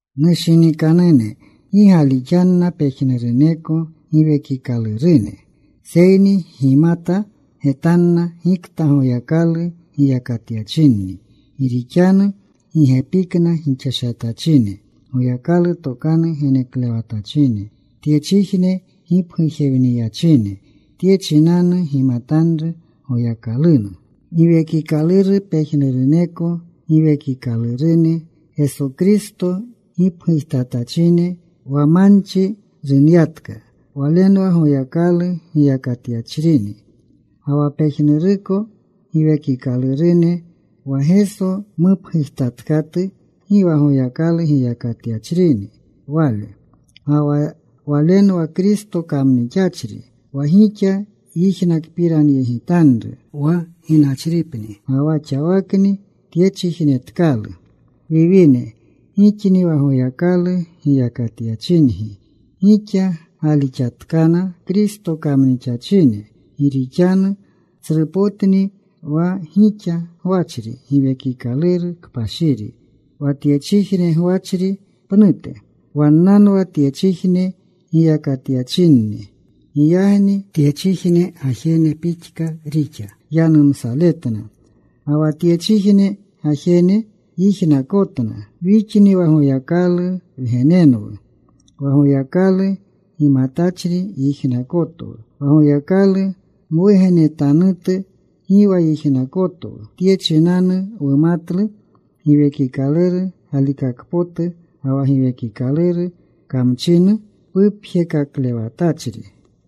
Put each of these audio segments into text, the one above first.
Nushinikanune, gi galixanna pejnuruneko giwekikalurune, seyni gimata getanna gikta Goyakalu giyakatyachinni. Gi rixanu gi gepikna gixashatachine Goyakalu tokanu geneklewatachine tyechijne gipgujewniyachine. Tye chinanu gimatanru Goyakalunu Giwekikaluru. Pejnuruneko giwekikalurune Geso Kristo gipgujtatachine wa manchi runyatka, walenwa Goyakalu giyakatyachrini. Ga wa pejnuruneko giwekikalurune wa Geso mupgujtatkatu, gi wa Goyakalu giyakatyachrini wale. Ga wa walenwa Kristo kamnixachri, wa gixa yijnakpiranyegitanru wa ginachripni. Ga wa xawakni tyechijnetkalu. Wiwine, gixni wa Goyakalu giyakatyachingi. Gixa gaalixatkana Kristo kamnixachine. Gi rixanu tsrupotni wa gixa gwachri Giwekikaluru Kpashiri wa tyechijne gwachri pnute. Wannanwa tyechijne giyakatyachinni. Giyagni tyechijne gajene pixka rixa yanumsaletna, ga wa tyechijne gajene yijnakotna. Wixni wa Goyakalu wgenenwu. Wa Goyakalu gimatachri yijnakotwu. Wa Goyakalu mwugenetanutu gi wa yijnakotwu. Tye chinanu wumatlu Giwekikaluru galikakpotu, ga wa giwekikaluru kamchinu pupjekaklewatachri.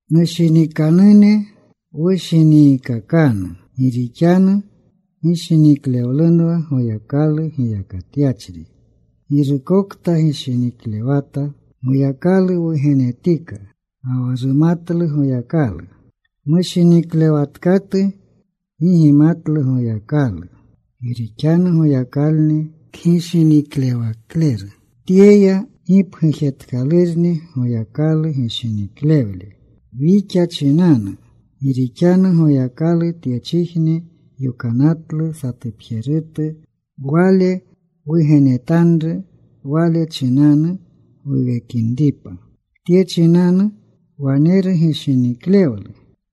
Nushinikanune, wushiniikakanu, gi rixanu gishiniklewlunwa Goyakalu giyakatyachri. Girukokta gishiniklewata Goyakalu wugenetika, ga wa rumatlu Goyakalu. Mushiniklewatkatu gi gimatlu Goyakalu. Gi rixanu Goyakalni kgishiniklewakleru. Tyeya gipgujetkalurni Goyakalu gishiniklewle wixa chinanu, gi rixanu Goyakalu tyechijne yokanatlu satupjerutu Wale Wugenetanru, Wale chinanu wuwekinripa. Tye chinanu waneru gishiniklewlu.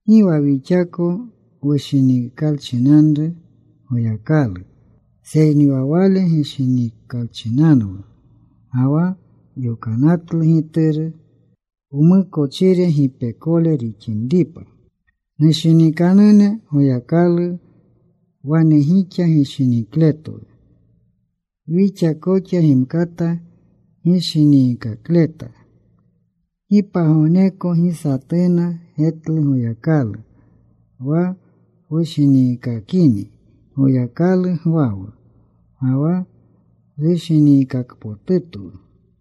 Gi wa wixako wushinikalchinanru Goyakalu, seyni wa Wale gishinikalchinanwu. Ga wa yokanatlu Gituru wmukochire gipekole rixinripa. Nushinikanune, Goyakalu wane gixa gishinikletwu, wixa koxa gimkata gishiniikakleta. Gi pagogneko gi satuna getlu Goyakalu. Wa wushiniikakini, Goyakalu gwawu ga wa rushiniikakpotutwu.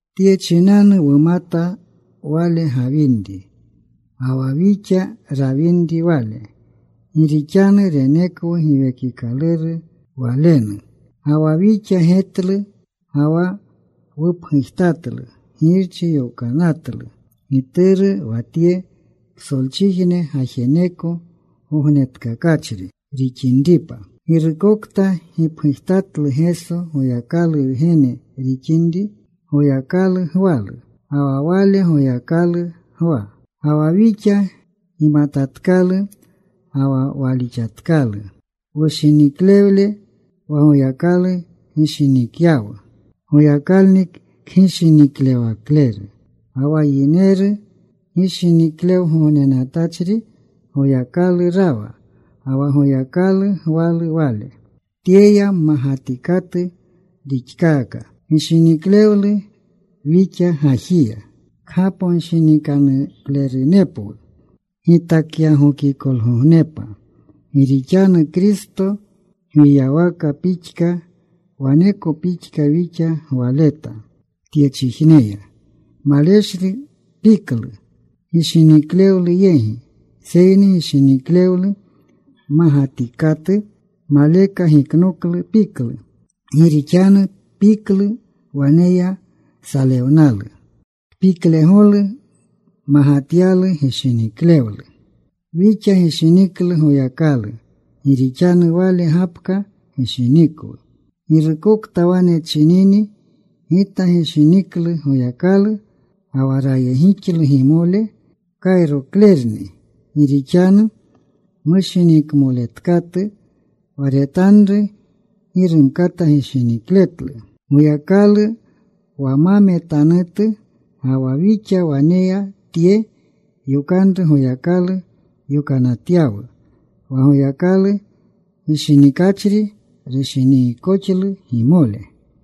Tye chinanu wumata Wale gawinri, ga wa wixa rawinri Wale, gi rixanu renekwu Giwekikaluru Walenu. Ga wa wixa getlu, ga wa wupgujtatlu Girchi yokanatlu Gituru wa tye psolchijne gajeneko Gognetkakachri rixinripa. Girukokta gipgujtatlu Geso Goyakalu Wgene rixinri, Goyakalu gwalu ga wa wale Goyakalu gwa. Ga wa wixa gimatatkalu ga wa walixatkalu rushiniklewle wa Goyakalu gishinikyawu. Goyakalni kgishiniklewakleru, ga wa yineru gishiniklewgognenatachri Goyakalu rawa ga wa Goyakalu gwalu wale. Tyeya mmagatikatu rixkaaka gishiniklewlu wixa gajiya, kgaponshinikanuklerunepwu gitakyagokikolgognepa. Gi rixanu Kristo gwiyawaka pixka waneko pixka wixa gwaleta tyechijneya. Maleshlu piklu gishiniklewlu yegi. Seyni gishiniklewlu mmagatikatu maleka giknoklu piklu. Gi rixanu piklu waneya salewnalu. Kpiklegolu magatyalu gishiniklewlu. Wixa gishiniklu Goyakalu gi rixanu Wale gapka gishinikwu. Girukokta wane chinini, “Gita gishiniklu Goyakalu,” ga wa rayegixlu gimole, kayroklerni. Gi rixanu mushinikmoletkatu wa retanru, gi rumkata gishinikletlu Goyakalu wa ma metanutu. Ga wa wixa waneya tye yokanru Goyakalu yokanatyawu, wa Goyakalu gishinikachri rushinikankoxlu gimole.